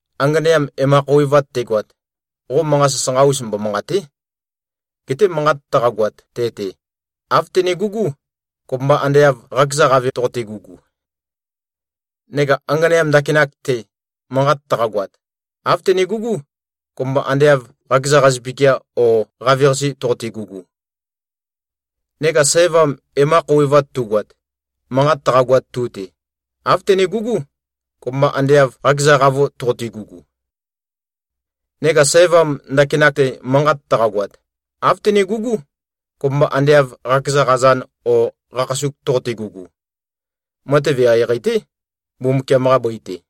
Anganeam e-ma-khouwevat tegoat, qo manqa sasanqa-us mbomanqàte᷄. Geté manqat taqagoat te-te, āv tønegugú, kopømba ande av qakeza qave toqote-gugu. Neka anganeam ndakinak-te, manqat taqagoat, āv tønegugú, kopømba ande av qakeza qazøpikia o qaveqase toqote-gugu. Neka sævam e-ma-khouwevat tugoat, manqat taqagoat tu-te, āv tønegugú, kopømba ande av qakeza qavo toqote-gugu. Neka sævam ndakinak-te manqat taqagoat, āv tønegugú, kopømba ande av qakeza qazan o qakhasuk toqote-gugu. Matev eqeieqei-té, Mbumbukiam-qa bøi-te.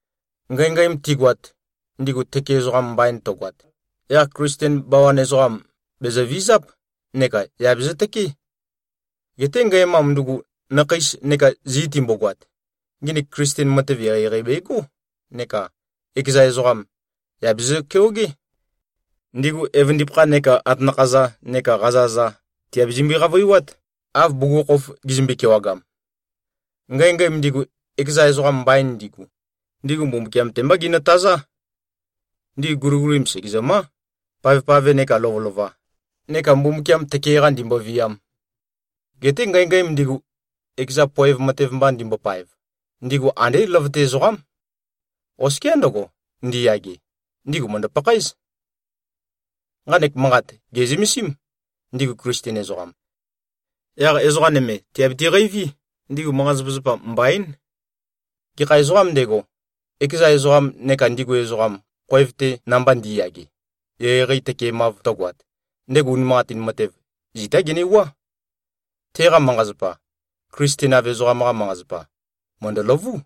Ngængæm tigoat, ndigu tøke ezoqa mbain tøgoat, yaq Klisten bawan ezoqam, bèzøvizáp neka yà bezøtøkeé. Geté ngæmam ndugu, nakheis neka zi timbogoat, nginik Klisten matev eqeieqei begó neka ekeza ezoqam, yà bezø-keogé. Ndigu evøndipakha neka atanakha-za neka qaza-za, tìabezømbe-qavøiwát, av bugukhokhof gizømbe-kewagam. Ngængæm ndigu, ekeza ezoqam mbain ndigu, ndigu Mbumbukiam-te mbá ginøtazá. Ndigu guligulim, sègezømá, pavpave nekā lovølova, neka Mbumbukiam tøke-qa ndīmbōvīām. Geté ngængæm ndigu, ekeza poev matev mba ndimbopaev, ndigu andé løvøte ezoqám. Oskiá ndøgo, ndiyage, ndigu mø̀ndø-pakhaéz. Nqanek manqat gè꞉zømesím, ndigu Klisten ezoqam. Yaq ezoqa nøme, tìabiti-qeiví, ndigu manqa-zapazapa mbaín. Gekha ezoqām ndego, ekeza ezoqam neka ndigu ezoqam, khoev-te namba ndi꞉yage, eqeieqei tøkemav tøgoat, ndego unimanqatin matev, zitá genewuá. Teqa manqa-zapa, Klisten-av ezoqam-qa manqa-zapa, mø̀ndøløvú.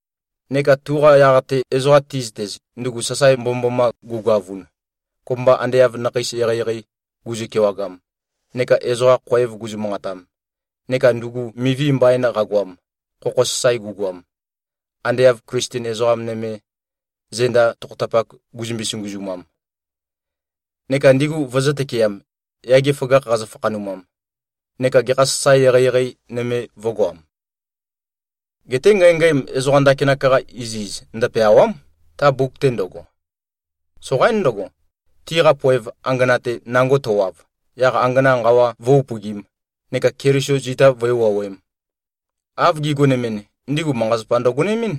neka tuqa yaq-te, ezoqa ti꞉zøtez, ndugu sasae mbomømboma gugoavun, kopømba ande av nakheis eqeieqei guzø-kewagam, neka ezoqa khoev guzø-manqatam, neka ndugu mivi mbain qagoam, khokho sasae gugoam, ande av Klisten ezoqa nøme, zenda tokhotapak guzømbe-sunguzumam neka ndigu vøzø̄-tøkeam, yage føgakh qazø-fakhanumam, neka gekha sasae eqeieqei nøme vø̄goam. Geté ngængæm ezoqa ndakinak-qa iziz ndøpeàwa᷄m, ta mbuk-te ndøgo. Soqaín ndøgo, tiqa poev angana-te nango tøwav, yaq angana nqawa vǿ-upøgīm, neka Keliso zita vǿe-wuowēm. Av gigonemɨn, ndigu manqa-zapa ndøgonemɨ́n.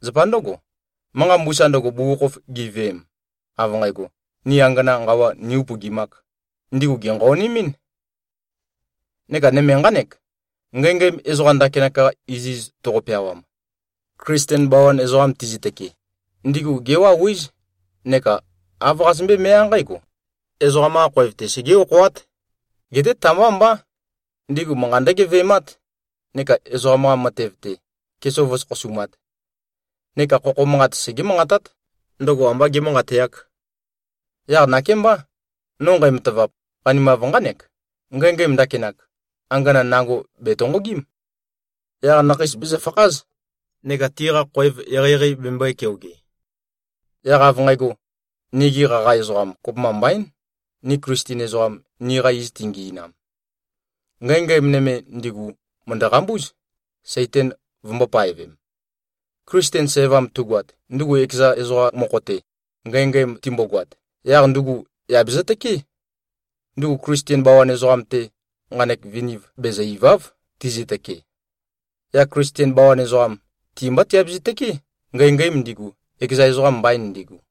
Zapa ndǿgo, manqa mbusa ndøgo, bugukhokhof giveem, av nqægo, “Ni angana nqawa nī-upøgimāk,” ndigu gènqaonemɨ́n. Neka nøme nqánek: Ngængæm ezoqa ndakinak-qa iziz toqo-peawam, Klisten bawan ezoqam tizøtøke, ndigu géwauwíz neka āv qazømbé-meá nqǽgo: Ezoqam-qā khoev-te segé-okhoát. Geté ta-mbá mbá. Ndigu manqa ndǿgeve꞉mát neka ezoqam-qa matev-te, kesov vǿsokhosumāt. Neka khokho manqat segé-manqatát, ndøgo ambā gēmanqateāk. Yaq nakémbá, no nqæmatavap, qanimav nqánek: Ngængæm ndakinak, angana nango bètonqogím. Yaq nakheis bezøfakház neka tiqa khoev eqeieqei bembøē-keoge. Yaq av nqægo, nigi qaqa ezoqam kopømba mbaín, ni Klisten ezoqam, niqa iz tingi꞉nam. Ngængæm nøme, ndigu mø̀ndø-qambúz, Saitan vømbō-paevem. Klisten sævam tugoat, ndugu ekeza ezoqa mokho-te, ngængæm timbogoat, yaq ndugu yà bezøtøkeé. Ndugu Klisten bawan ezoqam-te nqanek viniv bezø-ìva᷄v, tizøtøkee. Yaq Klisten bawan ezoqam, ti-mbá tiabezø-tøkeé, ngængæm ndigu, ekeza ezoqam mbain ndigu.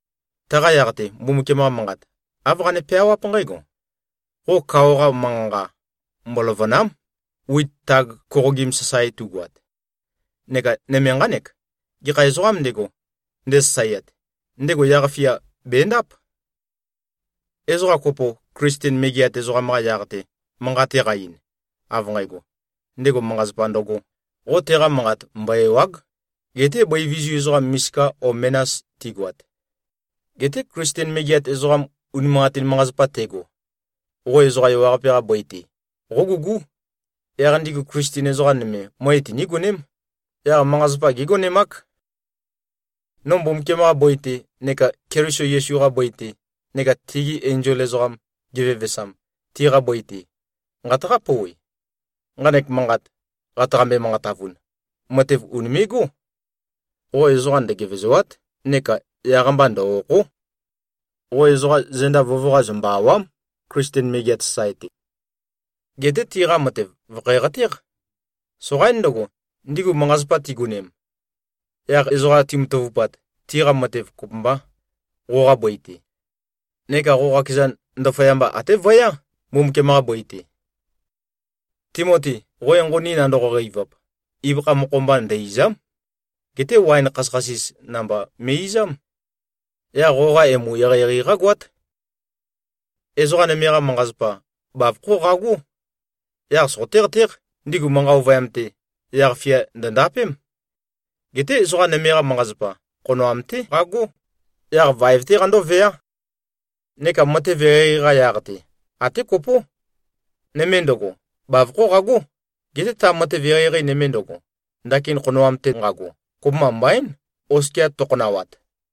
Taqa yaq-te, Mbumbukiam-qa Manqat, āv qane-peawáp nqǽgo, “Qo kao-qa manqa-nqa, mboløvø̀na᷄m, wit tag koqogim sasae tugoat.” Neka nøme nqánek, “Gekha ezoqām ndego, ndesasaeat, ndego yaq-fia bèndáp.” Ezoqa kopo, Klisten megeat ezoqam-qa yaq-te, manqat teqa-ein, av nqægo, ndego manqa-zapa ndøgō, qo teqa manqat mbo-èwa᷄g, geté bøi vizu ezoqam misika o menas tigoat. Geté Klisten megeat ezoqam unimanqatin manqa-zapa tego, qo ezoqa ewaqape-qa bøi-te, qógugú. Yaq ndigu Klisten ezoqa nøme, møe tinígoném, yaq manqa-zapa gégonemák. No Mbumbukiam-qa bøi-te neka Keliso Yesu-qa bøi-te neka tegi enzol ezoqam, gevevesam, tiqa bøi-te, nqataqá-pouwe: Nqanek manqat, qataqambe-manqatavun, matev ùnime꞉gó. Qo ezoqa ndøgevezòa᷄t, neka yaq-mba ndø-òkho᷄. Qo ezoqa zenda vøvøqa zømbø-àwa᷄m, Klisten megeat sasae-te. Geté tiqa matev vø̀khæqatéq. Soqaín ndøgo, ndigu manqa-zapa tigonem, yaq ezoqa timatavupat, tiqa matev kopømbā qoqa bøi-te. Neka qo qakezan, ndaføyamba até vøyá, Mbumbukiam-qa bøi-te. Timoti, qo enqoni nandoqo-qeivap, ibøkha mokho-mba ndø-ìza᷄m. Geté waen khasøkhasis namba me꞉-izám. Yaq qoqa emu eqeieqei qágoát. Ezoqa nøme-qa manqa-zapa, bavokhó qagó. Yaq soqoté-qatéq, ndigu manqa ovøyam-te, yaq-fia ndø̀ndapém. Geté ezoqa nøme-qa manqa-zapa, khonoam-té qagó, yaq vaev-té qandóveá. Neka matev eqeieqei-qa yaq-te, até kopó. Nøme ndøgo, bavokhó qagó. Geté ta matev eqeieqei nøme ndøgo, ndakin khonoam-te nqago, kopømba mbaín, oskia tøkhonawat.